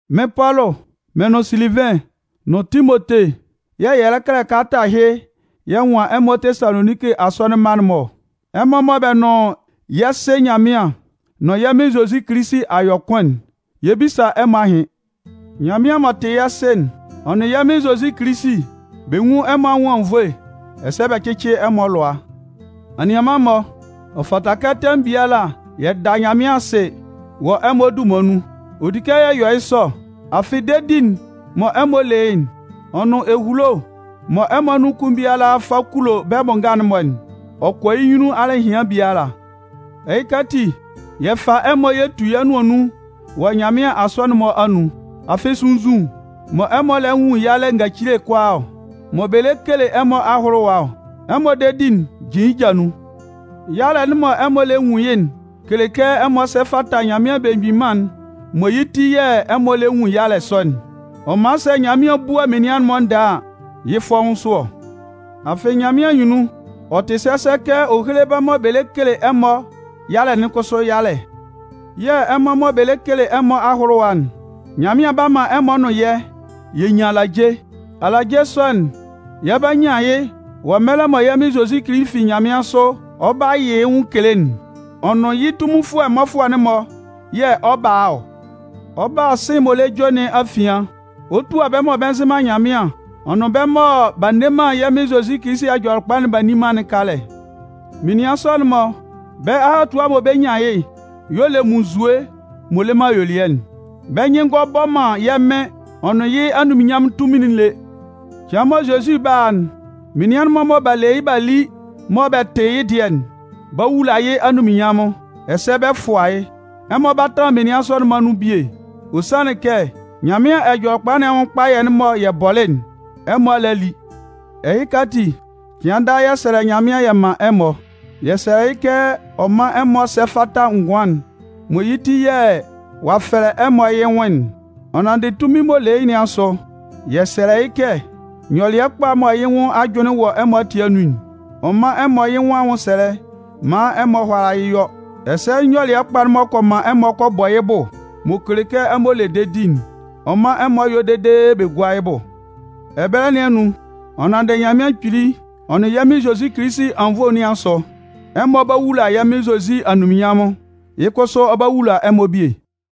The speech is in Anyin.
Mɩ́n Pɔlʋ, mɩn nʋn Silivɩn nʋn Timote yɛ̂ yɛ lɛ kɛlɛ kalata ɛhɩ yɛ nwan ɛmɔ Tesaloninki asɔnɩn mma'n-mɔ ɔ. Ɛmɔ mɔ bɛ nʋn yɛ́ Sɩ Nyanmɩan nʋn yɛ́ Mɩn Zozi Kilisi a yɔ kʋn'n, yɛ 'bisa ɛmɔ ahɩn. Nyanmɩan m'ɔ tɩ yɛ́ Sɩ'n, ɔ nʋn yɛ́ Mɩn Zozi Kilisi, bɛ nwún ɛmɔ anwʋn anwunnvoe, ɛsɛ bɛ cɩ́cɩ ɛmɔ alʋa. Anianman-mɔ, ɔ fata kɛ tɛmʋn biala yɛ da Nyanmɩan asɩ wɔ ɛmɔ dunman nun. Ɔ di kɛ yɛ yɔ yɩ́ sɔ, afɩ dedi'n mɔ ɛmɔ le yɩ́'n, ɔ nʋn ehulo mɔ ɛmɔ anun kʋn biala fa kulo bɛ́ bʋ nga'n-mɔ'n, ɔ kɔ yɩ́ nyunnun alɩhɩan biala. Ɛhɩka ati, yɛ fa ɛmɔ yɛ tu yɛ́ nʋan nun wɔ Nyanmɩan asɔnɩn'n-mɔ anun. Afɩ sunnzun mɔ ɛmɔ lɛ nwun yalɛ ngacile kʋalaa, mɔ bɛ lɛ kele ɛmɔ ahʋlʋwa ɔ, ɛmɔ dedi'n jin yɩ́ ja nun. Yalɛ'n mɔ ɛmɔ lɛ nwun yɩ́'n kele kɛ ɛmɔ sɛ fata Nyanmɩan Belemgbin Mân'n mɔ yɩ́ ti yɛ̂ ɛmɔ lɛ nwun yalɛ sɔ'n. Ɔ man sɛ Nyanmɩan 'bua menian'n-mɔ ndɛɛ a, yɩ́ fɔ́ʋ́n sʋ ɔ. Afɩ, Nyanmɩan anyunnun, ɛ tɩ sɛsɛ kɛ ɔ héle bɛ́ mɔ bɛ lɛ kele ɛmɔ yalɛ'n kʋsʋ yalɛ yɛ̂ ɛmɔ mɔ bɛ lɛ kele ɛmɔ ahʋlʋwa'n, Nyanmɩan 'ba man ɛmɔ nʋn yɛ́, yɛ 'nyan alaje. Alaje sɔ'n, yɛ 'ba nyan yɩ́ wɔ mɛlɛ mɔ yɛ́ Mɩn Zozi fi nyanmɩansʋ ɔ 'ba yɩ yɩ́ nwʋn kele'n. Ɔ nʋn yɩ́ tunminfʋɛ mmɔfʋɛ'n-mɔ yɛ̂ ɔ 'ba a ɔ. Ɔ 'ba a sɩ̂n m'ɔ lɛ jue nɩn afian, ɔ 'tua bɛ́ mɔ bɛ nzɩ man Nyanmɩan ɔ nʋn bɛ́ mɔ b'a nne man yɛ́ Mɩn Zozi Ɛjɔlɛkpa'n b'a nni man'n kalɛ. Menian sɔ'n-mɔ, bɛ́ ahatua mɔ bɛ 'nyan yɩ́'n y'ɔ le munnzue m'ɔ le man ayuelɩɛ'n. Bɛ́ nyɩn ngɔ bɔ man yɛ́ Mɩn ɔ nʋn yɩ́ anunminnyanmʋn tunmin'n lé. Cɩan mɔ Zozi 'ba a'n, menian'n-mɔ mɔ b'a le yɩ́ b'a li mɔ bɛ tɩ yɩ́ dɩɛ'n 'ba wula yɩ́ anunminnyanmʋn, ɛsɛ bɛ 'fʋa yɩ́. Ɛmɔ 'ba tanlan menian sɔ'n-mɔ anun bie. Ɔ sanlɩn kɛ Nyanmɩan Ɛjɔlɛkpa nɩn anwʋn kpayɛ'n mɔ yɛ bɔlɩ'n, ɛmɔ a le a li. Ɛhɩka ati, cɩan daa yɛ sɛlɛ Nyanmɩan yɛ man ɛmɔ. Yɛ sɛlɛ yɩ́ kɛ ɔ mán ɛmɔ sɛ́ fata ngʋan'n mɔ yɩ́ ti yɛ̂ ɔ'a fɛlɛ ɛmɔ yɩ́ nwʋn'n. Ɔ nanndɩ tunmin'n m'ɔ le yɩ́ nɩn asʋ, yɛ sɛlɛ yɩ́ kɛ, nyɔlɩɛ kpa mɔ yɩ́ nwʋn ajʋnlɩn wɔ ɛmɔ ati anun'n, ɔ mán ɛmɔ yɩ́ nwʋn anwʋnsɛlɛ maan ɛmɔ hʋ́ala yɩ́ yɔ́. Ɛsɛ nyɔlɩɛ kpa m'ɔ kɔ man ɛmɔ kɔ bɔ yɩ́ bʋ, m'ɔ kele kɛ ɛmɔ le dedi'n, ɔ mán ɛmɔ yɔ́ dede bɛ gúa yɩ́ bʋ. Ɛbɛlɛ nɩn anun, ɔ nanndɩ Nyanmɩan Kpili ɔ nʋn yɛ́ Mɩn Zozi Kilisi anwunnvoe nɩn asʋ, ɛmɔ 'ba wula yɛ́ Mɩn Zozi anunminnyanmʋn, yɩ́ kʋsʋ, ɔ 'ba wula ɛmɔ bie.